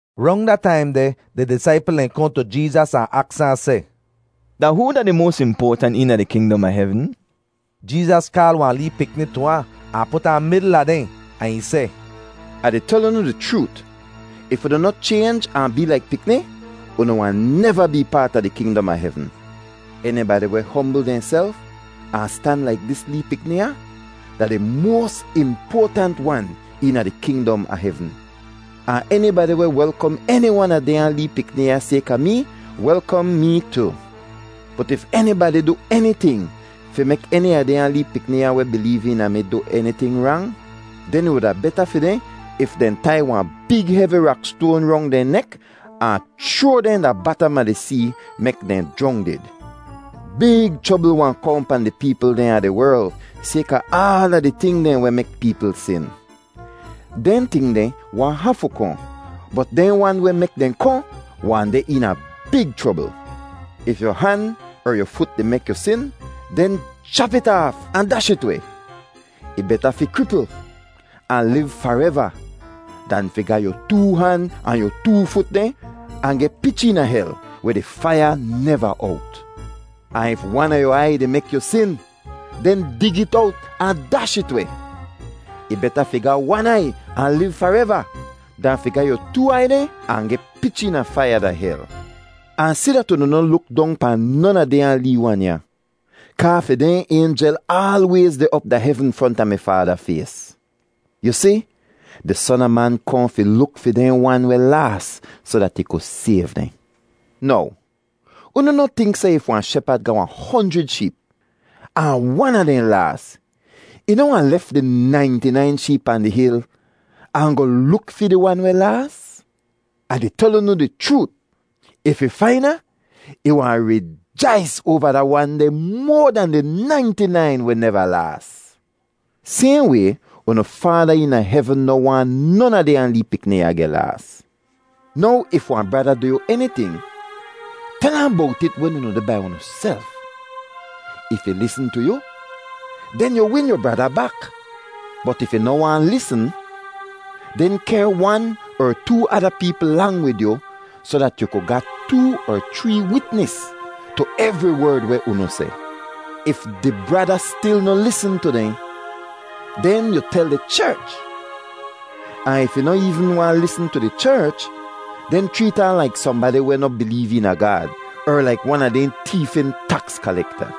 Rong da taim deh, di disaipl dehn kohn tu Jeezas ahn aks ahn seh, “Da hoo da di moas impoatant eena di kingdom a hevn?” Jeezas kaal wahn lee pikni tu ahn, ahn put ahn midl a dehn, ahn ih seh, “Ah di tel unu di chroot, if unu noh chaynj ahn bee laik pikni, unu wahn neva bee paat a di kingdom a hevn. Enibadi weh hombl dehnself ahn stan laik dis lee pikni ya, da di moas impoatant wan eena di kingdom a hevn. Ahn enibadi weh welkom eni wan a dehnya lee pikni ya sayka mee, welkom mee tu. “Bot if enibadi du eniting fi mek eni a dehnya lee pikni ya weh bileev eena mi du eniting rang, den ih wuda beta fi dehn if dehn tai wahn big hevi rakstoan rong dehn nek ahn chroa dehn da batam a di see mek dehn jrongdid. “Big chrobl wahn kohn pahn di peepl dehn a di werl sayka aala di ting dehn weh mek peepl sin. Dehn ting deh wahn hafu kohn, bot dehn wan weh mek dehn kohn wahn deh eena big chrobl. “If yu han er yu fut di mek yu sin, den chap it aaf ahn dash it weh. Ih beta fi kripl ahn liv fareva dan fi ga yu too han ahn yu too fut dehn ahn geh pich eena hel weh di faiya neva owt. Ahn if wan a yu aiy di mek yu sin, den dig it owt ahn dash it weh; ih beta fi ga wan aiy ahn liv fareva dan fi ga yu too aiy dehn ahn geh pich eena faiya da hel. “Ahn si dat unu noh luk dong pahn non a dehnya lee wan ya, kaa fi dehn aynjel aalwayz deh op da hevn fronta mi Faada fays. [Yu si, di Son a Man kohn fi luk fi dehn wan weh laas soh dat ih ku sayv dehn.] “Now unu noh tink seh if wahn shepad ga wahn honjrid sheep, ahn wan a dehn laas, ih noh wahn lef di nainti-nain sheep pahn di hil ahn goh luk fi di wan weh laas? Ah di tel unu di chroot, if ih fain ahn, ih wahn rijais oava da wan deh moa dan di nainti-nain weh neva laas. Sayhn way unu Faada eena hevn noh waahn non a dehnya lee pikni ya geh laas. “Now if wahn brada du yu eniting, tel ahn bowt it wen unu deh bai unuself. If ih lisn tu yu, den yu win yu brada bak. Bot if ih noh waahn lisn, den kehr wan er too ada peepl lang wid yu soh dat ‘yu ku ga too er chree witnis tu evri werd weh unu seh.’ If di brada stil noh lisn tu dehn, den yu tel di cherch; ahn if ih noh eevn waahn lisn tu di cherch, den chreet ahn laik sohnbadi weh noh bileev eena Gaad er laik wan a dehn teefin taks kalekta.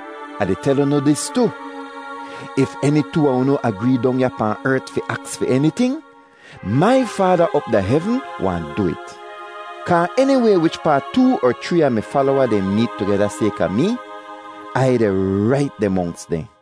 “Ah di tel unu dis tu, if eni too a unu agree dong ya pahn ert fi aks fi eniting, mai Faada op da hevn wahn du it. Kaa eniway wichpaa too er chree a mi falowa dehn meet tugeda sayka mee, Ai deh rait deh monks dehn.”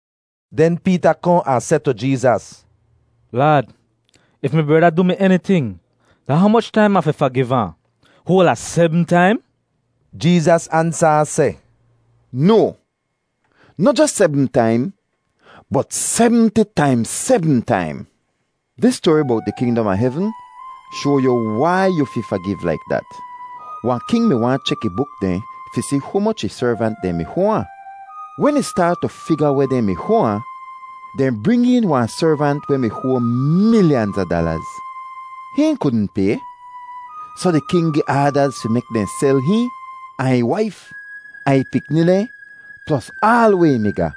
Den Peeta kohn ahn seh tu Jeezas, “Laad, if mi brada du mi eniting, da humoch taim Ah fi fagiv ahn? Hoal a sebm taim?” Jeezas ansa ahn seh, “No, noh jos sebm taim, bot semti taimz sebm taim. Dis stoari bowt di kingdom a hevn shoa yu wai yu fi fagiv laik dat: “Wahn king mi waahn chek ih buk dehn fi si humoch ih servant dehn mi hoa ahn. Wen ih staat tu figa weh dehn mi hoa ahn, dehn bring een wahn servant weh mi hoa milyanz a dalaz. Hihn kudn pay, soh di king gi aadaz fi mek dehn sel hihn, ahn ih waif ahn ih pikni dehn, plos aal weh ih mi ga,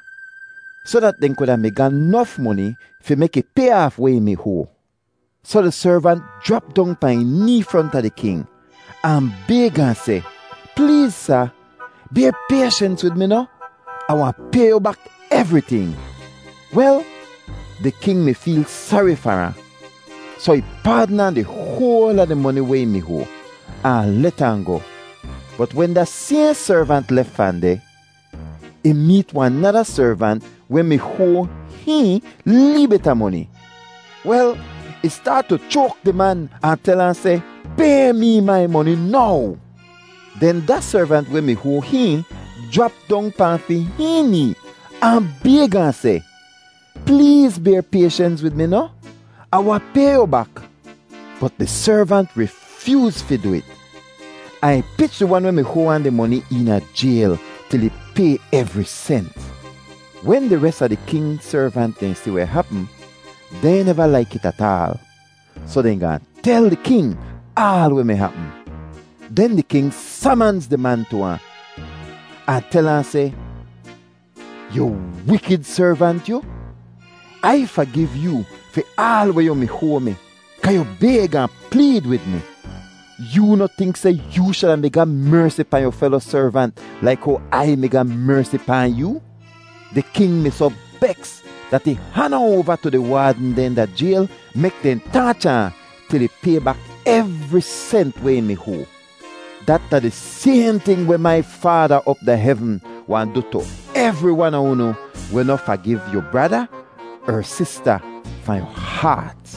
soh dat dehn kuda mi ga nof moni fi mek ih pay aaf weh ih mi hoa. “Soh di servant jrap dong pahn ih nee fronta di king ahn bayg ahn seh, ‘Pleez sa, bayr payshens wid mi noh? Ah wahn pay yu bak evriting.’ Wel, di king mi feel sari far ahn, soh ih paadn ahn di hoal a di moni weh ih mi hoa ahn let ahn goh. “Bot wen da sayhn servant lef fahn deh, ih meet wahn nada servant weh mi hoa hihn lee bit a moni. Wel, ih staat tu choak di man ahn tel ahn seh, ‘Pay mee mai moni now!’ “Den da servant weh mi hoa hihn jrap dong pahn fi hihn nee ahn bayg ahn seh, ‘Pleez bayr payshens wid mi noh? Ah wahn pay yu bak.’ “Bot di servant rifyooz fi du it, ahn ih pich di wan weh mi hoa ahn di moni eena jayl til ih pay evri sent. Wen di res a di king servant dehn si weh hapm, dehn neva laik it ataal, soh dehn gaahn tel di king aal weh mi hapm. “Den di king samanz di man tu ahn, ahn tel ahn seh, ‘Yu wikid servant yu! Ai fagiv yoo fi aal weh yu mi hoa mi kaa yu bayg ahn pleed wid mi. Yoo noh tink seh yoo shuda mi ga mersi pahn yu felo servant laik how Ai mi ga mersi pahn yoo?’ Di king mi soh beks dat ih han ahn oava tu di waadn dehn da jayl mek dehn taacha ahn til ih pay bak evri sent weh ih mi hoa. “Dat da di sayhn ting weh mai Faada op da hevn wahn du tu evri wan a unu weh noh fagiv yu brada er sista fahn yu haat.”